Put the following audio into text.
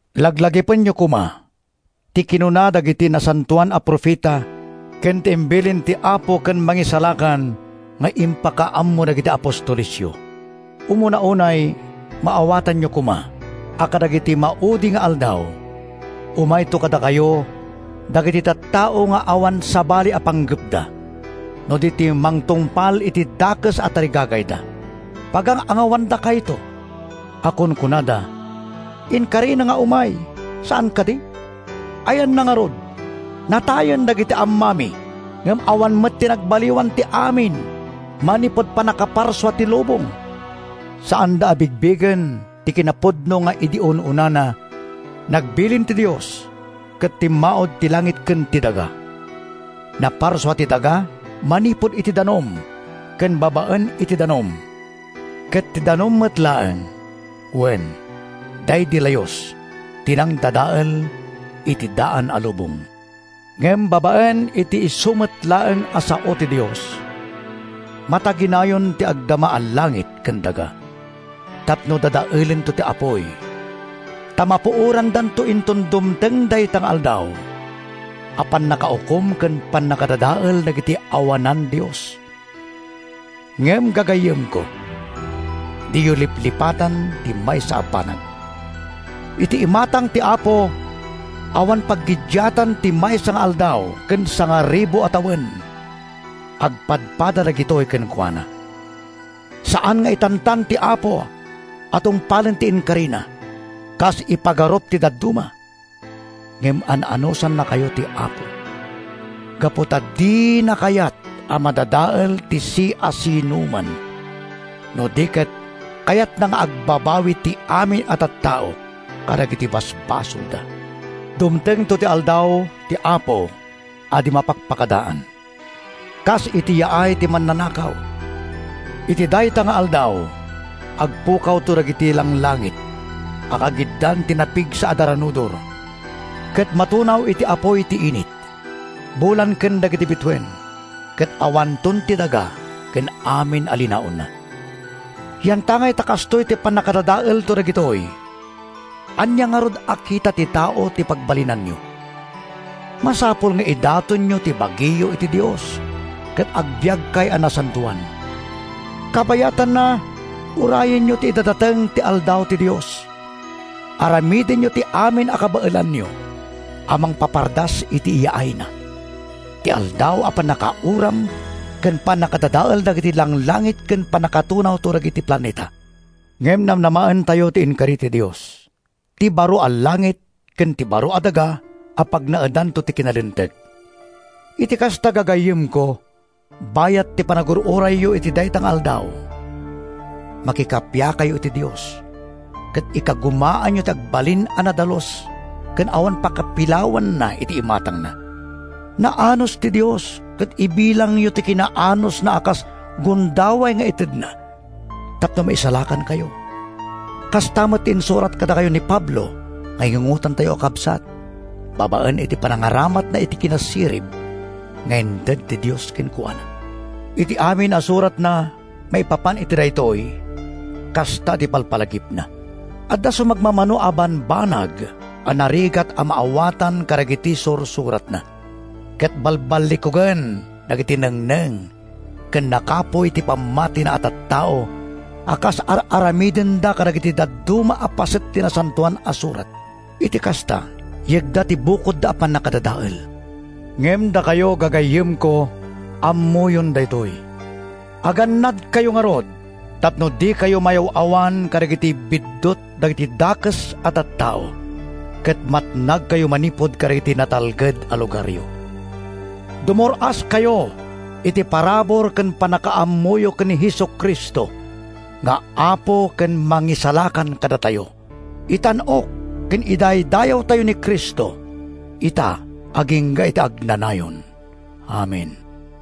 Laglagipenyo koma ti kinuna dagidi nasantoan a profeta ken ti imbilin ti Apo ken Mangisalakan nga impakaammo dagiti apostolesyo. Umuna unay, maawatanyo koma a kadagiti maudi nga aldaw, umayto kadakayo dagiti tattao nga awan sabali a panggepda no di ti mangtungpal iti dakes a tarigagayda. Pagang-angawandakayto a kunkunada, “Inkarina nga umay, saan kadi? Ayanna ngarud? Natayen dagiti ammami, ngem awan met nagbaliwan ti amin manipud pannakaparsua ti lubong!” Saanda a bigbigen ti kinapudno nga idi un-unana, nagbilin ti Dios ket timmaud ti langit ken ti daga. Naparsua ti daga manipud iti danum ken babaen iti danum. Ket ti danum met laeng, wen, daydi Layus, ti nangdadael iti daan a lubong. Ngem babaen iti isu met laeng a sao ti Dios, mataginayon ti agdama a langit ken daga tapno dadaelento ti apuy. Ta mapuorandanto inton dumteng dayta nga aldaw a pannakaukom ken pannakadadael dagiti awanan-dios. Ngem, gagayyemko, diyo liplipatan ti maysa a banag! Iti imatang ti Apo, awan paggiddiatan ti maysa nga aldaw ken sangaribu a tawen. Agpadpada dagitoy kenkuana. Saan nga itantan ti Apo a tungpalen ti inkarina, kas ipagarup ti dadduma. Ngem an-anusannakayo ti Apo gapu ta dina kayat a madadael ti siasinoman, no di ket kayatna nga agbabawi ti amin a tattao kadagiti basbasolda. Dumtengto ti Aldaw ti Apo a di mapakpakadaan, kas iti yaay ti mannanakaw. Iti dayta nga Aldaw, agpukawto dagiti langlangit a kagiddan ti napigsa a daranudor, ket matunaw iti apuy ti init, bulan ken dagiti bituen ket awanton ti daga ken amin a linaonna. Yantangay ta kastoy ti pannakadadaelto dagitoy, ania ngarud a kita ti tao ti pagbalinanyo? Masapul nga idatonyo ti bagiyo iti Dios ket agbiagkay a nasantoan. Kabayatanna, urayenyo ti idadateng ti Aldaw ti Dios. Aramidenyo ti amin a kabaelanyo a mangpapardas iti yaayna—ti Aldaw a pannakauram ken pannakadadael dagiti langlangit ken pannakatunawto dagiti planeta. Ngem namnamaentayo ti inkari ti Dios: ti baro a langit ken ti baro a daga a pagnaedanto ti kinalinteg. Iti kasta, gagayyemko, bayat ti panagur-urayyo iti dayta nga Aldaw, makikappiakayo iti Dios ket ikagumaanyo ti agbalin a nadalus ken awan pakapilawanna iti imatangna. Naanus ti Dios ket ibilangyo ti kinaanusna a kas gundaway nga itedna tapno maisalakankayo. Kasta met ti insurat kadakayo ni Pablo nga ingungotentayo a kabsat babaen iti panangaramatna iti kinasirib nga inted ti Dios kenkuana. Iti amin a suratna maipapan iti daytoy, kasta ti ipalpalagipna. Adda sumagmamano a bambanag a narigat a maawatan kadagiti sursuratna, ket balballikugen dagiti nengneng ken nakapuy ti pammatina a tattao a kas ar-aramidenda kadagiti dadduma a paset ti Nasantoan a Surat. Iti kasta, yegda ti bukodda a pannakadadael. Ngem dakayo, gagayyemko, ammoyon daytoy. Agannadkayo ngarud tapno dikayo mayaw-awan kadagiti biddut dagiti dakes a tattao ket matnagkayo manipud kadagiti natalged a lugaryo. Dumur-askayo iti parabur ken pannakaammoyo ken ni Jesu-Cristo nga Apo ken Mangisalakan kadatayo. Itan-ok ken idaydayawtayo ni Cristo, ita agingga iti agnanayon! Amen.